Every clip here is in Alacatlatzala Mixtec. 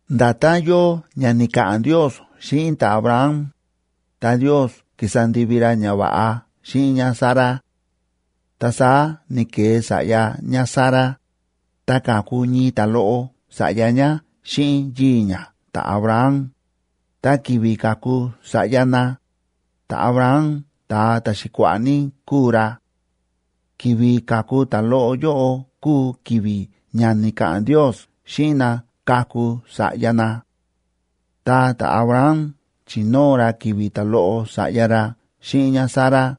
Nda̱tán yóo ña ni̱ka̱ꞌa̱n Ndios xíꞌin ta̱Abraham, ta Ndiosa ki̱sa ndivi ra ñava̱ꞌa xíꞌin ñáSara. Ta saá ni̱ke̱e sa̱ꞌya ñáSara, ta ka̱ku ñii ta̱loꞌo sa̱ꞌya ñá xíꞌin yii̱ ñá ta̱Abraham, ta ki̱vi̱ ka̱ku sa̱ꞌya na, ta̱Abraham ta̱a ta̱xi̱kua̱ꞌa̱ ní kúu ra. Ki̱vi̱ ka̱ku ta̱loꞌo yóꞌo kúu ki̱vi̱ ña ni̱ka̱ꞌa̱n Ndios xíꞌin na kaku sa̱ꞌya na. Ta ta̱Abraham chi̱nóo ra ki̱vi̱ ta̱loꞌo sa̱ꞌya ra xíꞌin ñáSara,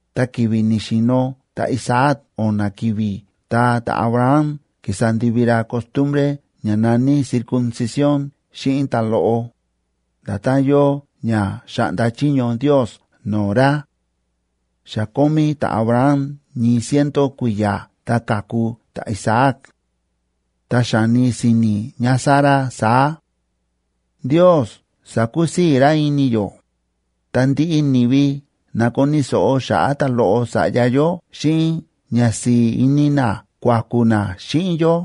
ta ki̱vi̱ ni̱xi̱no̱ ta̱Isaac o̱na̱ ki̱vi̱, ta ta̱Abraham ki̱sa ndivi ra costumbre ña na̱ní circuncisión xíꞌin ta̱loꞌo, nda̱tán yóo ña xa̱ꞌnda chiño Ndios no̱o̱ ra. Xa kómí ta̱Abraham ñii ciento kui̱ya̱ ta ka̱ku ta̱Isaac. Ta xa̱ni si̱ni̱ ñáSara saá: “Ndios sa̱kusii̱ ra ini yó, ta ndiꞌi ni̱vi na koni̱ so̱ꞌo xa̱ꞌa̱ ta̱loꞌo sa̱ꞌya yó, xíꞌin ñasi̱i̱ ini na kuaku̱ na xíꞌin yó.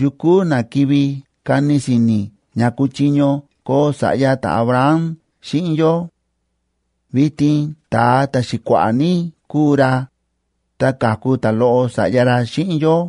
¿Yukú na kivi kani si̱ni̱ ña kuchiño koo sa̱ꞌya ta̱Abraham xíꞌin yó? Vitin ta̱a ta̱xi̱kua̱ꞌa̱ ní kúu ra, ta ka̱ku ta̱loꞌo sa̱ꞌya ra xíꞌin yó.”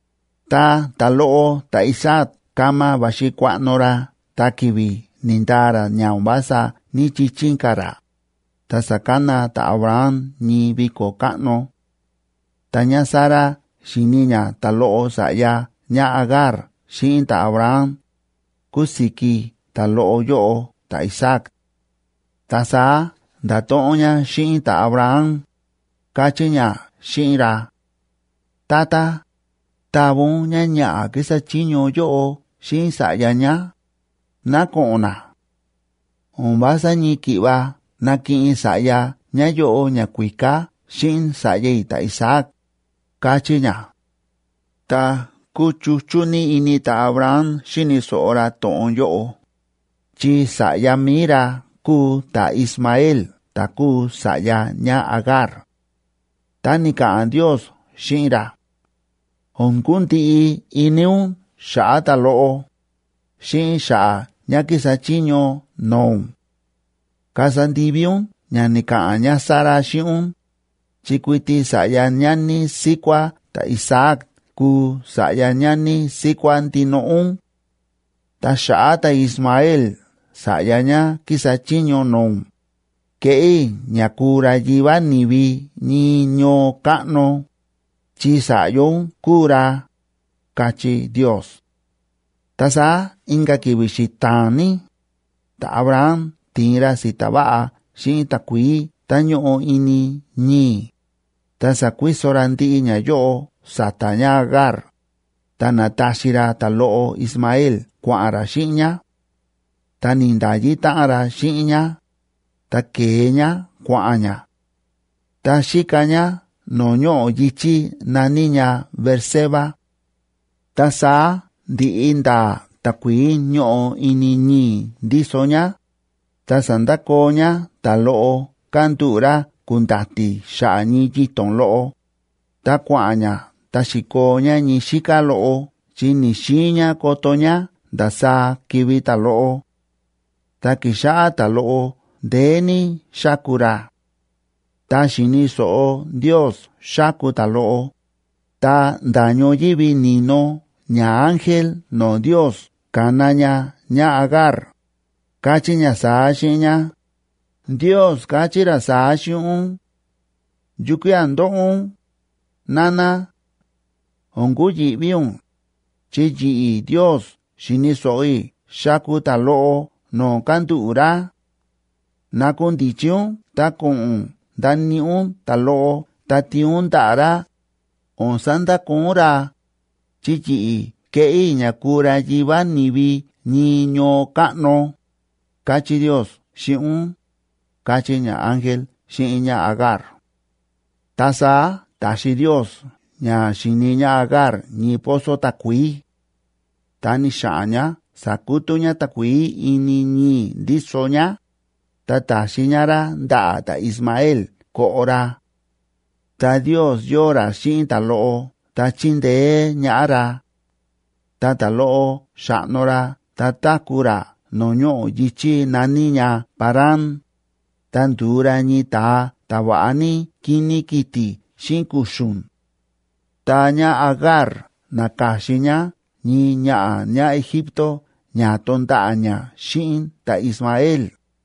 Ta ta̱loꞌo ta̱Isaac kama va̱xi kuaꞌno ra ta ki̱vi̱ ni̱ndaa ra ña o̱n vása ní‑chichín ka̱ ra, ta sa̱kana ta̱Abraham ñii viko̱ káꞌno. Ta ñáSara xi̱ni ñá ta̱loꞌo sa̱ꞌya ñáAgar xíꞌin ta̱Abraham, ku̱siki ta̱loꞌo yóꞌo ta̱Isaac. Ta saá nda̱to̱ꞌon ñá xíꞌin ta̱Abraham, káchí ñá xíꞌin ra: ―Tata, ¡tava ún ñáñaꞌa̱ kísa chiño yóꞌo xíꞌin sa̱ꞌya ñá, ná ko̱ꞌo̱n na! O̱n vása ñii ki̱ꞌva nakiꞌin sa̱ꞌya ñáyóꞌo ñakuíká xíꞌin sa̱ꞌya i̱ ta̱Isaac ―káchí ñá. Ta kúchuchú ní ini ta̱Abraham xíni̱ so̱ꞌo ra to̱ꞌon yóꞌo, chi sa̱ꞌya mi̱i ra kúu ta̱Ismael ta̱ kúu sa̱ꞌya ñáAgar. Ta ni̱ka̱ꞌa̱n Ndios xíꞌin ra: ―O̱n kundiꞌi ini ún xa̱ꞌa̱ ta̱loꞌo, xíꞌin xa̱ꞌa̱ ñá kísa chiño no̱o̱ ún. Kasa ndivi ún ña ni̱ka̱ꞌa̱n ñáSara xíꞌin ún, chi kuiti sa̱ꞌya ñani síkuá ta̱Isaac kuu sa̱ꞌya ñani síkuá ndinoꞌo ún. Ta xa̱ꞌa̱ ta̱Ismael sa̱ꞌya ñá kísa chiño no̱o̱ ún, keꞌé i̱ ña kuu ra yivá ni̱vi ñii ñoo káꞌno, chi sa̱ꞌya ún kúu ra ―káchí Ndios. Ta saá inka̱ ki̱vi̱ xita̱a̱n ní, ta̱Abraham ti̱in ra si̱ta̱ va̱ꞌa xíꞌin takuií tá ñóꞌo ini ñii̱, ta sa̱kuiso ra ndiꞌi ñayóꞌo sa̱ta̱ ñáAgar, ta na̱taxi ra ta̱loꞌo Ismael kua̱ꞌa̱n ra xíꞌin ñá, ta ni̱nda̱yi táꞌan ra xíꞌin ñá. Ta ke̱e ñá kua̱ꞌa̱n ñá, ta xíka ñá no̱o̱ ñoꞌo̱ yi̱chí na̱ní ña Beerseba. Ta saá ndi̱ꞌi ndaa takuií ñóꞌo ini ñii̱ ndíso ñá, ta sa̱ndakoo ñá ta̱loꞌo kándúꞌu̱ ra ku̱nda̱ti̱ xa̱ꞌa̱ ñii yito̱n loꞌo, ta kua̱ꞌa̱n ñá ta xi̱koo ñá ñii xíká loꞌo, chi ni̱‑xiin ñá koto ñá ndasaá kivi̱ ta̱loꞌo. Ta ki̱xáꞌá ta̱loꞌo ndeé ní xáku ra. Ta xi̱ni̱ so̱ꞌo Ndios xáku ta̱loꞌo, ta nda̱ ñoyívi ni̱no ñaángel no̱o̱ Ndios ka̱na ña ñáAgar, káchí ña saá xíꞌin ñá: ―Ndios káchí ra saá xíꞌin ún: “¿Yukía̱ ndóꞌo ún?, nana. O̱n kuyi̱ꞌví ún, chi yi̱ꞌi̱ Ndios xi̱ni̱ so̱ꞌo i̱ xáku ta̱loꞌo no̱o̱ kándúꞌu̱ ra. Nakundichi ún ta ko̱ꞌo̱n ún ndaníꞌi ún ta̱loꞌo ta tiin ún ndaꞌa̱ ra, o̱n sandakoo ún ra, chi yi̱ꞌi̱ keꞌé i̱ ña kuu ra yivá ni̱vi ñii ñoo káꞌno”, káchí Ndios xíꞌin ún ―káchí ñaángel xíꞌin ñáAgar. Ta saá ta̱xi Ndios ña xi̱ni ñáAgar ñii pozo takuií. Ta ni̱xa̱ꞌa̱n ñá sa̱kutú ñá takuií ini ñii̱ ndíso ñá, ta ta̱xi ñá rá ndaꞌa̱ ta̱Ismael koꞌo ra. Ta Ndios yóo ra xíꞌin ta̱loꞌo ta chíndeé ñaꞌá ra. Ta ta̱loꞌo xa̱ꞌno ra ta táku̱ ra no̱o̱ ñoꞌo̱ yi̱chí na̱ní ña Parán, ta ndu̱u ra ñii ta̱a ta̱ va̱ꞌa ní kíní kiti̱ xíꞌin kuxu̱n. Ta ñáAgar na̱ka̱xin ñá ñii ñaꞌa̱ ñáEgipto ña to̱nda̱ꞌa̱ ñá xíꞌin ta̱Ismael.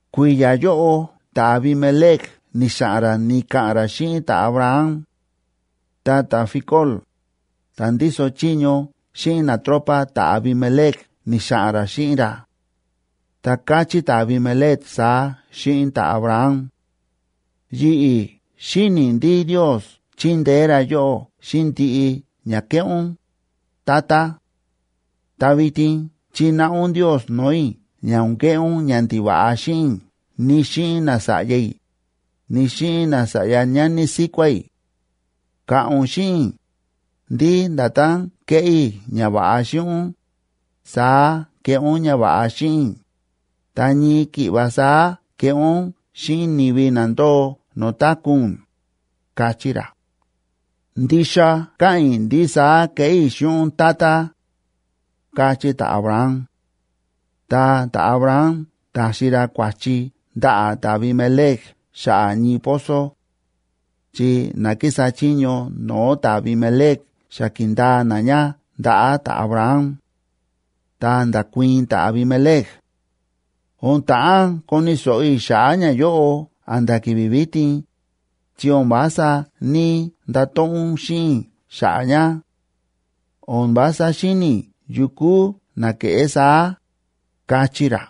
Kui̱ya̱ yóꞌo ta̱Abimelec ni̱xa̱ꞌa̱n ra ni̱ka̱ꞌa̱n ra xíꞌin ta̱Abraham. Ta ta̱Ficol, ta̱ ndíso chiño xíꞌin natropa ta̱Abimelec ni̱xa̱ꞌa̱n ra xíꞌin ra. Ta káchí ta̱Abimelec saá xíꞌin ta̱Abraham: ―Yi̱ꞌi̱ xíni i̱ ndí Ndios chíndeé ra yóꞌó xíꞌin ndiꞌi ña kéꞌé ún, tata. Ta vitin chináꞌa ún Ndios no̱o̱ i̱ ña o̱n keꞌé ún ñandiva̱ꞌa xíꞌin i̱, ni xíꞌin nasa̱ꞌya i̱, ni xíꞌin nasa̱ꞌya ñani síkuá i̱. Ka̱ꞌa̱n ún xíꞌin i̱, ndí nda̱tán kéꞌé i̱ ñava̱ꞌa xíꞌin ún, saá keꞌé ún ñava̱ꞌa xíꞌin i̱, ta ñii ki̱ꞌva saá keꞌé ún xíꞌin ni̱vi na ndóo no̱o̱ táku̱ ún ―káchí ra. ―Ndixa káꞌa̱n i̱ ndí saá keꞌé i̱ xíꞌin ún, tata ―káchí ta̱Abraham. Ta ta̱Abraham ta̱xi ra kua̱chi ndaꞌa̱ ta̱Abimelec xa̱ꞌa̱ ñii pozo; chi na kísa chiño no̱o̱ ta̱Abimelec xa ki̱ndaa na ña ndaꞌa̱ ta̱Abraham. Ta nda̱kuii̱n ta̱Abimelec: ―O̱n ta̱ꞌán koni̱ so̱ꞌo i̱ xa̱ꞌa̱ ñayóꞌo a̱nda̱ ki̱vi̱ vitin, chi o̱n vása ní‑ndato̱ꞌon ún xíꞌin i̱ xa̱ꞌa̱ ña. O̱n vása xíni̱ i̱ yukú na ke̱ꞌé saá ―káchí ra.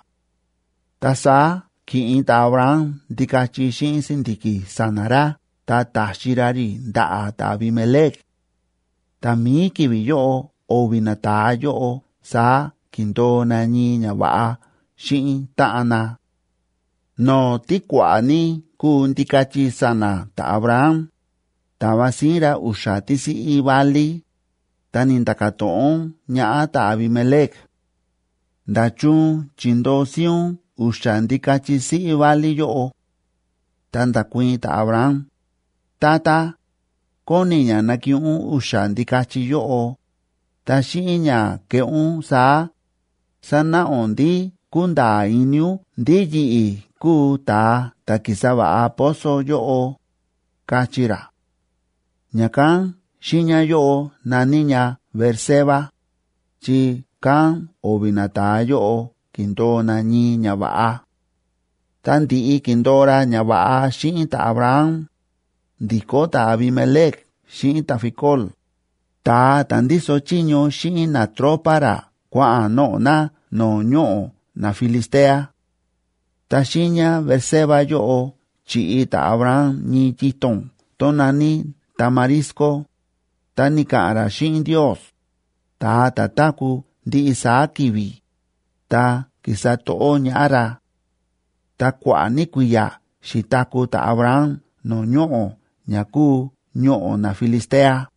Ta saá ki̱ꞌin ta̱Abraham ndikachi xíꞌin si̱ndi̱ki̱ sa̱na̱ ra, ta ta̱xi ra rí ndaꞌa̱ ta̱Abimelec; tá mií ki̱vi̱ yóꞌo o̱vi̱ nata̱a yóꞌo saá ki̱ndo̱o na ñii ñava̱ꞌa xíꞌin táꞌan na. No̱o̱ tí kua̱ꞌa̱ ní kúu ndikachi sa̱na̱ ta̱Abraham, ta̱va síín ra u̱xa̱ tísiꞌí válí, ta ni̱nda̱ka̱ to̱ꞌon ñaꞌá ta̱Abimelec: ―¿Nda̱chun chi̱ndoo síín ún u̱xa̱ ndikachi siꞌí válí yóꞌo? Ta nda̱kuii̱n ta̱Abraham: ―Tata, kóni i̱ ña nakiꞌin ún u̱xa̱ ndikachi yóꞌo, ta xíꞌin ña keꞌé ún saá, sanáꞌa ún ndí kúnda̱a̱ ini ún ndí yi̱ꞌi̱ kúu ta̱a ta̱ ki̱sa va̱ꞌa pozo yóꞌo ―káchí ra. Ña̱kán xiiña yóꞌo na̱ní ña Beerseba,c chi kán o̱vi̱ nata̱a yóꞌo ki̱ndo̱o na ñii ñava̱ꞌa. Ta ndi̱ꞌi ki̱ndo̱o ra ñava̱ꞌa xíꞌin ta̱Abraham, ndi̱kó ta̱Abimelec xíꞌin ta̱Ficol, ta̱a ta̱ ndíso chiño xíꞌin natropa ra kua̱ꞌa̱n noꞌo̱ na no̱o̱ ñoꞌo̱ naFilistea. Ta xiiña Beerseba yóꞌo chi̱ꞌi ta̱Abraham ñii yito̱n tón na̱ní tamarisco, ta ni̱ka̱ꞌa̱n ra xíꞌin Ndios, ta̱a ta̱ táku̱ ndiꞌi saá ki̱vi̱, ta ki̱sa to̱ꞌó ñaꞌá ra. Ta kua̱ꞌa̱ ní kui̱ya̱ xi̱taku̱ ta̱Abraham no̱o̱ ñoꞌo̱ ña kúu ñoꞌo̱ naFilistea.